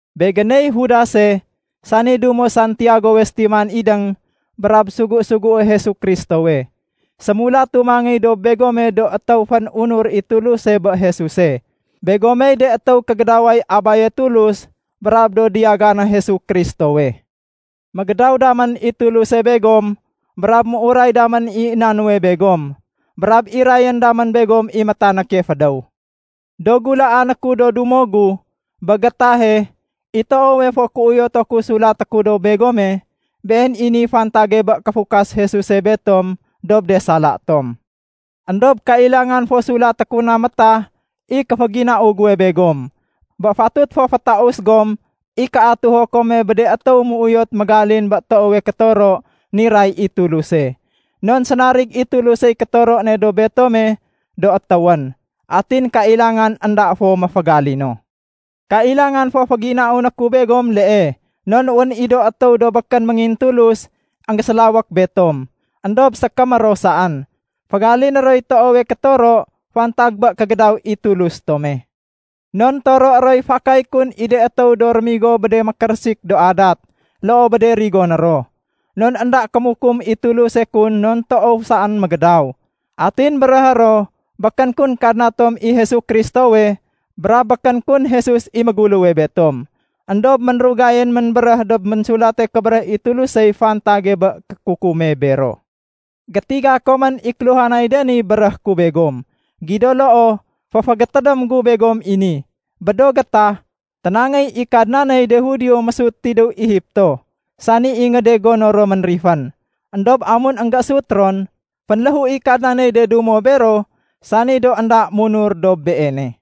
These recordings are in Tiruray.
Begéney Judase, sani dumo Santiagowe sétiman idéng, brab sugu-sugué Jesu Kristowe. Sémulatu mangéy dob begome do étéw fén-unur i Tuluse bé Jesuse. Begomey de étéw kégédaway Abaye Tulus brab do diyagané Jesu Kristowe. Mégédaw damén i Tuluse begom, brab méuray damén i na nuwe begom, brab irayén damén begom i métanéke fédéw. Do gulaané ku do dumo gu, bé gétahe, i toowe fo kéuyotu ku sulaté ku dob begome, been i niy fantage bé kéfukas Jesuse betom dob de sala tom. Endob kailangan fo sulaté ku na métah i kéféginau guwe begom bé fatut fo fétaus gom i kéatuho kome bé de étéw méuyot mégalin bé toowe kétoro niray i Tuluse. Non sénarig i Tulusey kétoro ne dob betome do étéwén. Atin kailangan énda fo méfégalino. Kailangan fo féginauné ku begom lee non wén i do étéw do békén méngintulus énggésélawék betom, éndob sékémé ro saén. Fégaliné roy toowe kétoro fantag bé kégédaw i Tulus tome. Non toroé roy fakay kun i de étéw do rémigo bé de mékérésik do adat loo bé de rigoné ro, non énda kémukum i Tuluse kun non toow saén mégédaw. Atin béréhé ro békén kun Kadna tom i Jesu Kristowe brab békén kun Jesus i méguléwe betom. Endob ménrugayén ménbéréh dob Ménsulate Kébéréh i Tulusey fantage bé kékukume bero. Gétiga komén i kéluhanay de ni béréhé ku begom. Gido loo, féfégétédém gu begom i ni: Bé do gétah, ténangéy i Kadnaney de Judio mésut tidéw Egipto, sani ingéde gono ro ménrifén. Endob amun énggésut ron, fénléhu i Kadnaney de dumo bero sani do énda munur dob Beene.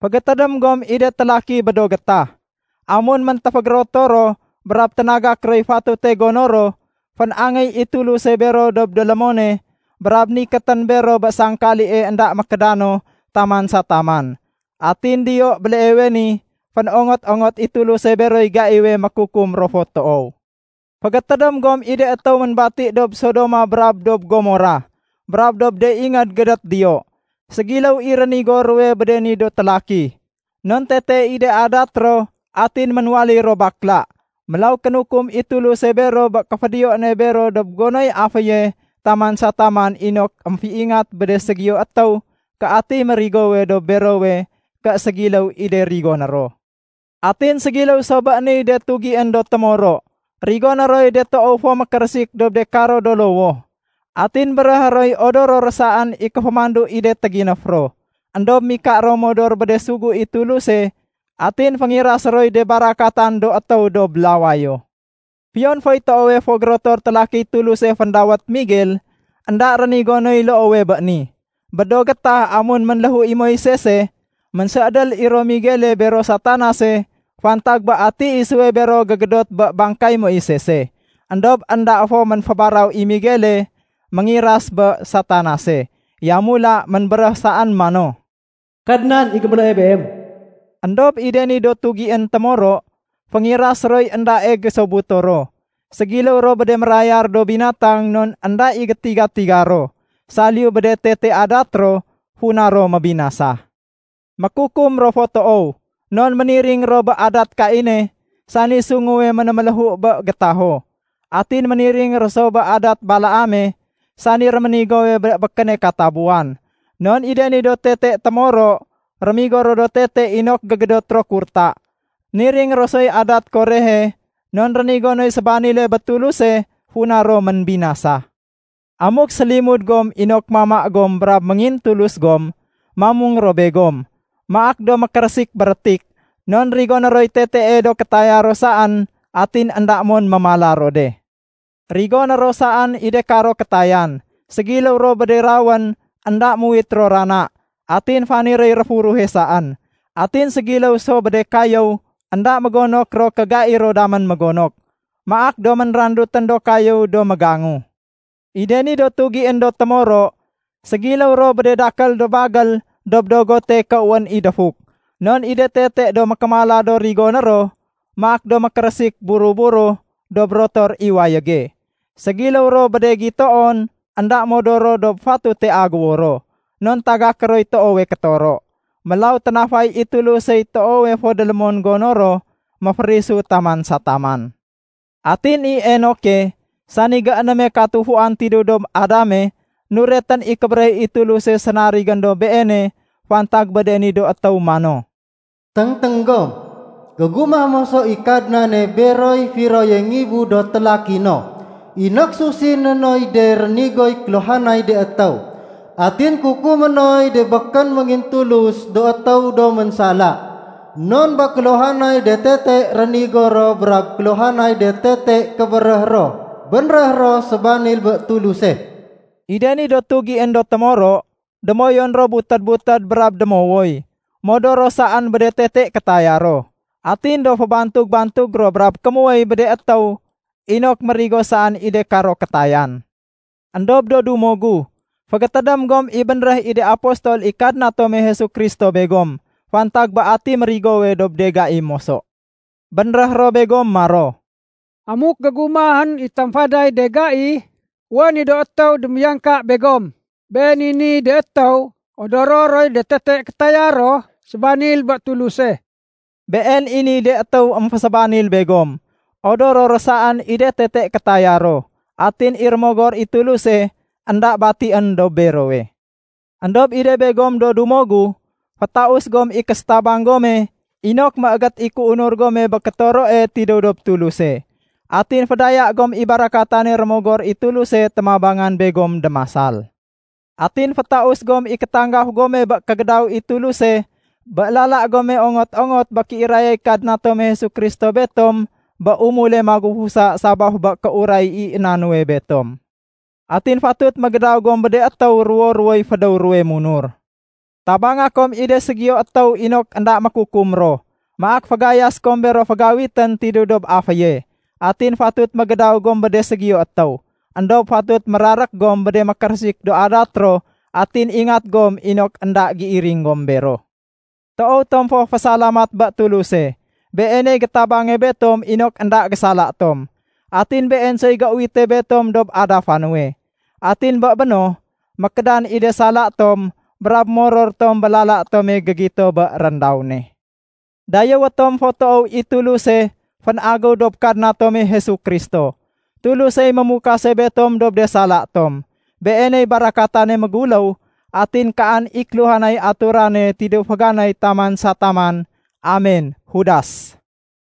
Fégétédém gom i de télaki bé do gétah. Amun méntéfégérotor ro brab ténagak roy fatute gono ro, fén-angéy i Tuluse bero dob délémone brab nikétén bero bé sangkalie énda mékédano taman sa taman. Atin diyo béleewe ni fénongot-ongot i Tuluse beroy gaiwe mékukum ro fo toow. Fégétédém gom i de étéw ménbati dob Sodoma brab dob Gomorah brab dob de ingéd gédét diyo. Ségiléw i rénigo ruwe bé de ni do télaki, non tete i de adat ro atin ménwaléy ro bakla. Mélaw kénukum i Tuluse bero bé kéfédiyo ne bero dob gonoy aféye taman sa taman inok émféingat bé de ségiyo étéw ké atiy mérigowe dob berowe ké ségiléw i de rigoné ro. Atin ségiléw so bé niy de tugién do témoro. Rigoné roy de toow fo mékérésik dob de karo do lowoh, atin béréhé roy odoro ro saén i kéfémandu i de téginéf ro. Endob mika ro modor bé de sugu i Tuluse atin féngirasé roy de barakatan do étéw dob lawayo. Fiyon foy toowe fo gérotor télakiy Tuluse féndawét Miguel, énda rénigo noy loowe bé ni. Bé do gétah amun ménléhu i Moisese, ménséédél i ro Miguele bero Satanase fantag bé ati isuwe bero gégédot bé bangkay Moisese. Endob énda fo ménfébaraw i Miguele méngiras bé Satanase. Yamula ménbéréh saén mano, “Kadnan i gémélée beem.” Endob i de ni do tugién do témoro, féngirasé roy éndae gésobuto ro. Ségiléw ro bé de mérayar do binatang non énda i gétiga-tiga ro saliyu bé de tete adat ro funa ro mébinasa. Mékukum ro fo toow, non méniring ro bé adat Kaine, sani sunguwe ménméléhu bé gétaho. Atin méniring ro so bé adat Balaame, sani réménigowe bé békéne katabuwan. Non i de ni do tete témoro, rémigo ro tete inok gégédot ro kurta. Niring ro soy adat Korehe non rénigo noy sébanile bé Tuluse funa ro ménbinasa. Amuk sélimud gom inok mama gom brab méngintulus gom, mamung ro begom. Maak do mékérésik bérétik, non rigone roy tetee do kétaya ro saén atin énda mon mémala ro de. Rigoné ro saén i de karo kétayan. Ségiléw ro bé de rawén énda muwit ro rana, atin faniréy réfuruhe saén. Atin ségiléw ro so bé de kayéw énda mégonok ro ké gai ro damén mégonok. Maak do ménrandutén do kayéw do mégangu. I de ni do tugién do témoro, ségiléw ro bé de dakél do bagél dob dogote ké wén i défuk, non i de tete do mékémala do rigoné ro, maak do mékérésik buro-buro dob rotor i wayége. Ségiléw ro bé de gitoon énda modor ro dob fatute aguwo ro, non tagaké roy toowe kétoro. Mélaw ténafay i Tulusey toowe fo délémon gono ro méférisu taman sa taman. Atin i Enoke, sani géénéme katufuan tidéw dob Adame, nuretén i kébéréh i Tuluse sénarigén dob beene fantag bé de ni do étéw mano, “Téngténg gom! Gégumah moso i Kadnane beroy firoye ngibu do télaki no, inok susiné noy de rénigoy kéluhanay de étéw. Atin kukumé noy de békén méngintulus do étéw do ménsala non bé kéluhanay de tete rénigo ro brab kéluhanay de tete kébéréh ro bénréh ro sébanil bé Tuluse.” I de ni do tugién do témoro, démoyun ro butédbutéd brab démowoy. Modor ro saén bé de tete kétaya ro. Atin do fébantug-bantug ro brab kémuwéy bé de étéw inok mérigo saén i de karo kétayan. Endob do dumo gu, fégétédém gom i bénréh i de apostol i Kadna tome Jesu Kristo begom fantag bé ati mérigowe dob de gai moso. Bénréh ro begom maro, “Amuk gégumahén i tamfaday de gai, wén i do étéw démiyangka begom. Been i niy de étéw odoro roy de tete kétaya ro sébanil bé Tuluse.” Been i niy de étéw émfésébanil begom. Odoro ro saén i de tete kétaya ro. Atin i Rémogor i Tuluse énda batién dob berowe. Endob i de begom do dumo gu, fétaus gom i késétabang gome inok méégét i kéunur gome bé kétoroe tidéw dob Tuluse. Atin fédaya gom i barakatane Rémogor i Tuluse témabangan begom démasal. Atin fétaus gom i kétanggaf gome bé kégédaw i Tuluse bé lala gome ongot-ongot bé kéirayay Kadna tome Jesu Kristo betom bé umule magufusa sabaf bé kéuray i na nuwe betom. Atin fatut mégédaw gom bé de étéw ruwo-ruwoy fédéw ruwe munur. Tabanga kom i de ségiyo étéw inok énda mékukum ro, maak fégayasé kom bero fégawitén tidéw dob aféye. Atin fatut mégédaw gom bé de ségiyo étéw. Endob fatut mérarék gom bé de mékérésik do adat ro atin ingat gom inok énda géiring gom bero. Toow tom fo fésalamat bé Tuluse. Beeney gétabange betom inok énda gésala tom, atin Been soy géuwite betom dob adafa nuwe. Atin bé béno, mékédan i de sala tom brab moror tom bé lala tome gégito bé réndaw ne. Dayéwé tom fo toow i Tuluse fénagéw dob Kadna tome Jesu Kristo. Tulusey mémukase betom dob de sala tom. Beeney barakatane méguléw atin kaan i kéluhanay aturane tidéw féganay taman sa taman. Amen. Judas